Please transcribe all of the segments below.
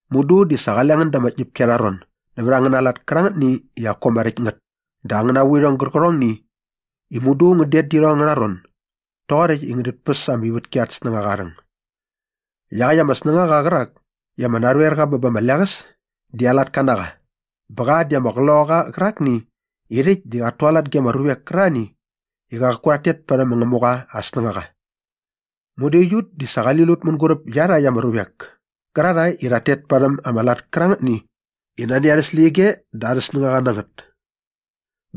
Mudu di sa qale ngän da ama tñäpki arha ron nävät angäna lat kärangätni i qaku ama räkt ngät dä angäna vuirhong gärqärhongni i mudu ngän det dä irhong angärha ron doqoräkt i ngänit päs ama ivätki at snängaqa aa rhäng. Iaqäkt ama snängaqa qärak i ama narhoerqa bä ba ama leqäs di aa latka na qa bä qa di ama qloqaqa qärakni i rhäkt di qat tualat ge ama ruvek kärarhani i qaku rhat tet parhäm ma Ngämuqa aa snängaqa. Mudu aiut di sa qali lut mänguräp iarhakt ama ruvek kärarhae i rhat tet parhäm ama lat kärangätni i nani arhä släqyige dä arhä snängaqa na ngät.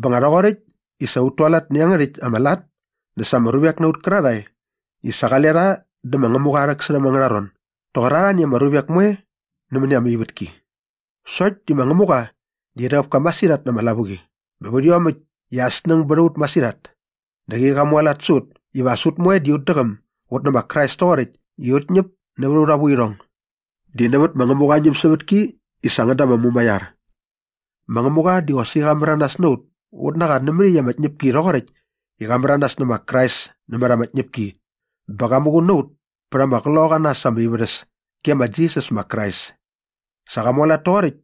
Bä nga rhoqoräkt i sa ut tualat nä iangärhäkt ama lat dä sa ama ruvek na ut kärarhae i sa qale rha dä ma Ngämuqa aa rhäksärhäm angärha ron doqor arhani ama ruvek moe nämäni ama ivätki. Sokt di ma Ngämuqa di rhäqäp ka masirhat na ama lavuqi bä nävät iomäkt i aa snäng bät a ut masirhat dä qäqi qa mualat sä ut iva as ut moe ut däqäm ut nä ma Krais toqoräkt i ut ñäp nävät aurha vuirhong. Di nävät ma Ngämuqa aa ñämsävätki i sa ngän da ama mumaiar. Ma Ngämuqa di qosaqi qa märanas na ut ut na qa nämät iaqyäkt ama tñäpki rhoqoräkt i qa märanas nä ma Krais nämät ama tñäpki bä qa muqun na ut pät ama qloqaqa na äs ama ivärhäs ge ma Jisas ma Krais. Sa qa mualat toqoräkt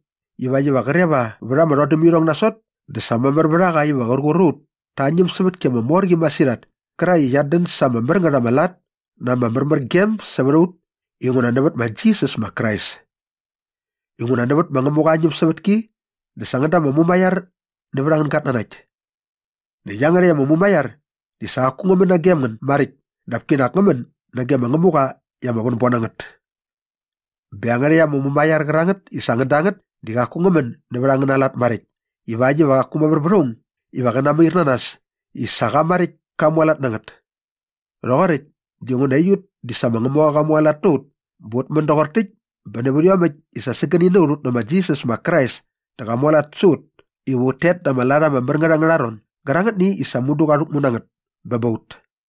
ivakt iva qre va vät ama rhodämirhong nasot dä sa mamär vät a qa iva qär qur a ut ta aa ñämsävätki ama mor qi masirhat kärakt i qiat dän sa ama mär ngät ama lat na ama märmärgem sävät a ut inguna nävät ma Jisas ma Krais. Inguna nävät ma Ngämuqa aa ñämsävätki dä sa ngän da ama mumaiar nävät angän gatnanakt. Näkt iangärhäkt ama mumaiar di sa qaku ngä män nagem ngän maräkt dap kinak ngä män nage ma Ngämuqa i ama vänbon na ngät. Bä iangärhäkt ama mumaiar qärangät i sa ngän da ngät di qaku ngä män nävät angäna lat maräkt ivakt iva qaku mamär vät aung iva qä namair na nas i sa qa maräkt ka mualat na ngät. Rhoqoräkt dinguna aiut di sa ma Ngämuqa qa mualat na ut bä ut män doqor täkt bä nävät iomäkt i sa sägäni na ut ut nä ma Jisas ma Krais dä qa mualat sä ut iva ut tet da ama lat ama mär ngät angärha ron gärangätni i sa mudu qa rhäkmu na ngät bä ba ut.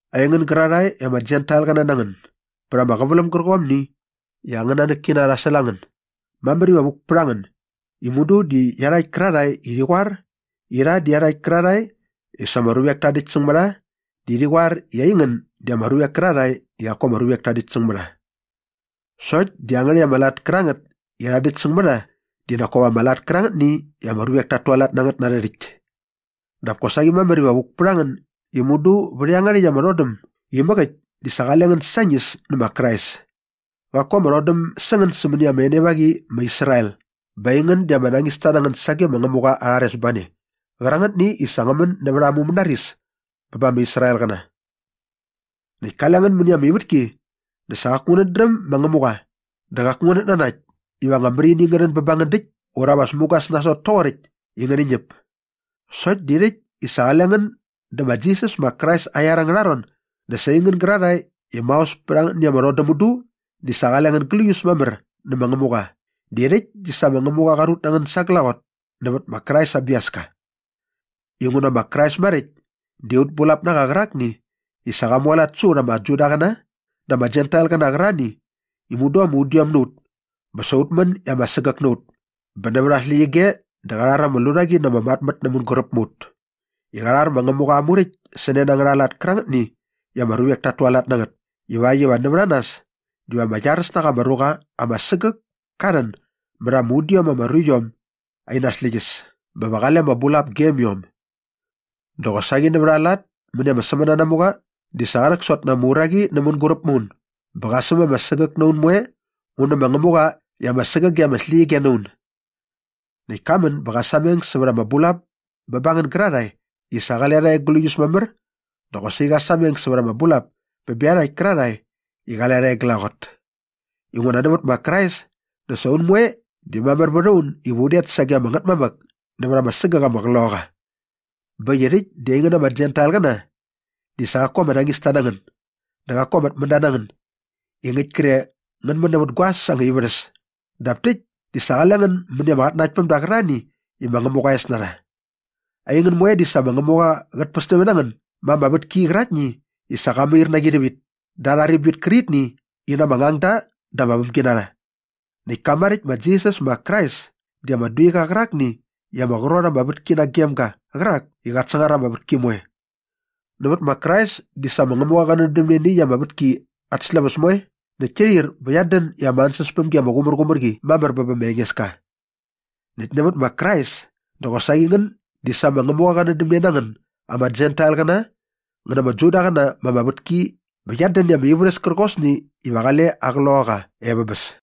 Aingän gärarhae i ama Jentailqäna na ngän bät ama qäväläm gärqomni i angän nanäkkina rha säl a ngän, mamär iva vuk pät a ngän i mudu di iarhakt kärarhae i rhi qoar i rha di iarhakt kärarhae i sa ama ruvek ta däkt säng mä rha di rhi qoar i aingän di ama ruvek kärarhae i qaku ama ruvek ta däkt säng mä rha. Sokt di iangärhäkt ama lat kärangät i rha däkt säng mä rha di nak kop ama lat kärangätni i ama ruvek tat tualat na ngät na arhä rhäkt. Dap kosaqi mamär iva vuk pät a ngän i mudu vät iangärhäkt ama rhodäm imäk äkt di sa qale ngän sañis nä ma Krais. Qaku ama rhodäm sä ngän sämäni ama enevaqi ma Israel bä aingän di ama nañista na ngän sage ma Ngämuqa aa rharesbane qärangätni i sa ngä män nävät aa mumänaris bä bä ma Israelqäna. Näkt kale ngän mäni ama ivätki dä sa qaku ngänät dräm ma Ngämuqa dä qaku ngänät nanakt iva anga märini ngä rhän bä ba ngän däkt ura va mugas nasot toqoräkt i ngäni ñäp. Sokt di rhäkt i sa qale ngän dä ma Jisas ma Krais aa iar angärha ron dä sa aingän gärarhae i maos pät angätni ama rhodäm mudu di sa qale ngän gläius mamär nä ma Ngämuqa di rhäkt di sa ma Ngämuqa qa rut na ngän sa glaqot nävät ma Krais aa biaska. Inguna ma Krais maräkt di aut bulap na qa qärakni i sa qa mualat sä ut ama Judaqäna dä ama Jentailqäna qärarhani i mudu ama udiom na ut bä sa ut män i ama sägäk na ut bä nävät aa släqyige dä qa rhar ama lurhaqi na ama matmät nä mänguräp mä ut i qa rhar ma Ngämuqa aa Muräkt sä ne na angärha lat kärangätni i ama ruvek tat tualat na ngät ivakt iva nävät a nas diva ama iaräs na qa ama ruqa ama sägäk ka rhän mät ama udiom ama ruiom in släqyäs bä va qale ama bulap gem iom. Dä qosaqi nävät aa lat mäni ama sämänanamuqa di sa qa rhäksot na ama uraqi nä mänguräp mä un bä qa säm ama sägäk na un moe un nä ma Ngämuqa i ama sägäge ama släqyige na un. Näkt ka män bä qa sameng sävät ama bulap bä ba ngän gärarhae i sa qale rha e gläius mamär dä qosaqi qa sameng sävät ama bulap bä bä iarhakt kärarhae i qale rha e glaqot. Inguna nävät ma Krais dä sa un moe di mamär vät a un iva un det sage ama Ngätmamäk nävät ama sägäk ama Qloqaqa. Bä äkt i rhäkt di aingän ama Jentailqäna di sa qaku ama nañista na ngän dä qaku ama tmända na ngän i ngäkt kre ngän män nävät guaäs anga ivärhäs dap täkt di sa qale ngän mäni ama qatnanaktpämda qärarhani i ma Ngämuqa aa es na rha. Aingän moe di sa ma Ngämuqa qät pästämne na ngän ma ama vätki qäraktni i sa qa mair na qi rhävit da arha ribit kärqitni i na ama ngangda dä na ama vämginarha. Näkt ka maräkt ma Jisas ma Krais di ama duiqa qärakni i ama qrot ama vätki nagem ga qärak i qat sangar ama vätki moe. Nävät ma Krais di sa ma Ngämuqa qä nändämne nä iaqyäkt ama vätki at släväs moe näkt ki rhir bä qiat dän i ama ansäspämgi ama qumärqumär qi mamär bä bä ma Engeska. Näkt nävät ma Krais dä qosaqi ngän di sa ma Ngämuqa qä nändämne na ngän ama Jentailqäna ngän na ama Judaqäna ma ama vätki bä qiat dän i ama ivärhäs kärqosni iva qale aa Qloqaqa e vä bäs.